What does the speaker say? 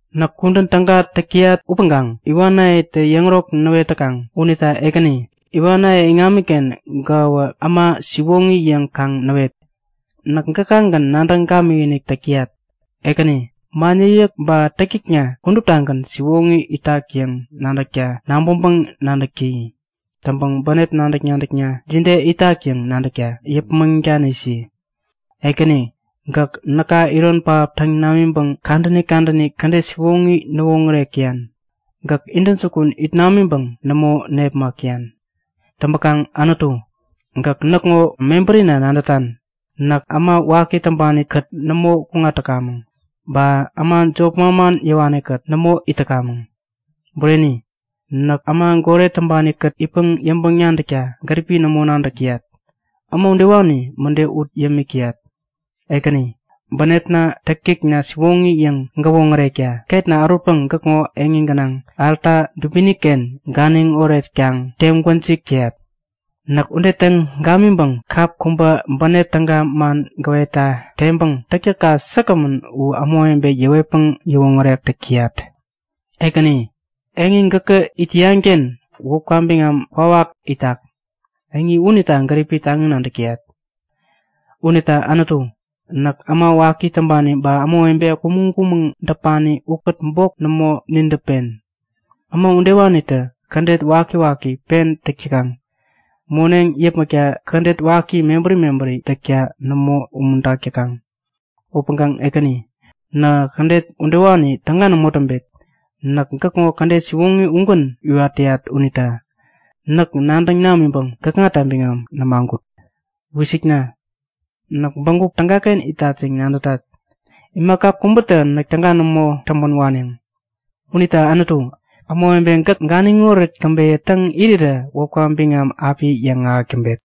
Näk kudän täga täk täyat upäŋkaŋ iwanayetä yäŋärok näwet täkaŋ. Unita Ekäni, iwanaye iŋamiken gäkäwä äma siwoŋi yäŋ kaŋ näwet! Näk gäkagän nadäŋ gamikinik täk täyat. Ekäni, man yäkyäk ba täktäkna kuduptagän siwoŋi itak yäŋ nadäkta nabäŋpäŋ-nadäk täyi. Täŋpäŋ bänep nadäk-nadäkna jide itak yäŋ nadäkta yäpmäŋ danisi. Ekäni, gäk näka iron pähap täŋ namiŋpäŋ kadäni kadäni kädet siwoŋi näwoŋärek täyan. Gäk intäjukun it namiŋpäŋ nämo nepmak täyan. Täŋpäkaŋ Anutu, gäk näkŋo mebärina nadätan. Näk äma waki täŋpanikät nämo kuŋat täkamäŋ. Ba äma jop manman yäwanikät nämo it täkamäŋ. Bureni, näk äma goret täŋpanikät itpäŋ yäŋpäŋ-nadäkta gäripi nämo nadäk täyat. Äma udewani mäde ut yämik täyat. Ekäni, bänepna, täktäkna siwoŋi yäŋ gäwoŋärekta ketna ärutpäŋ gäkŋo eŋi gänaŋ alta dubiniken ganiŋ oretkaŋ teŋ gwäjik täyat. Näk ude täŋ gamiŋpäŋ kap kubä bänep täga man gäwetta teŋpäŋ täktäkka säkgämän u ämawebe yäwetpäŋ yäwoŋärek täk täyat. Ekäni, eŋi gäkä it täyanken wäpka biŋam kwawak itak. Eŋi unita gäripi taŋi nadäk täyat. Unita Anutu, näk äma waki täŋpani ba ämawebe kumäŋ-kumäŋ däpani ukät bok nämo nidäpen! Äma udewanitä kädet wakiwaki pen täk täkaŋ. Moneŋ yäpmäkta kädet waki mebäri mebäri täkta nämo umuntak täkaŋ. Upäŋkaŋ Ekäni, nähä kädet udewani täga nämo täŋpet. Näk gäkŋo kädet siwoŋi ugän iwat täyat unita näk nadäŋ namiŋpäŋ gäkŋata biŋam nämagut. Wisikna! Näk bägup tägaken itat yäŋ nadätat. Imaka kubätä näk täga nämo täŋpän waneŋ. Unita Anutu, ämawebe gäk ganiŋoret käbeyä täŋ irirä wäpka biŋam api yäŋahäk täŋpet.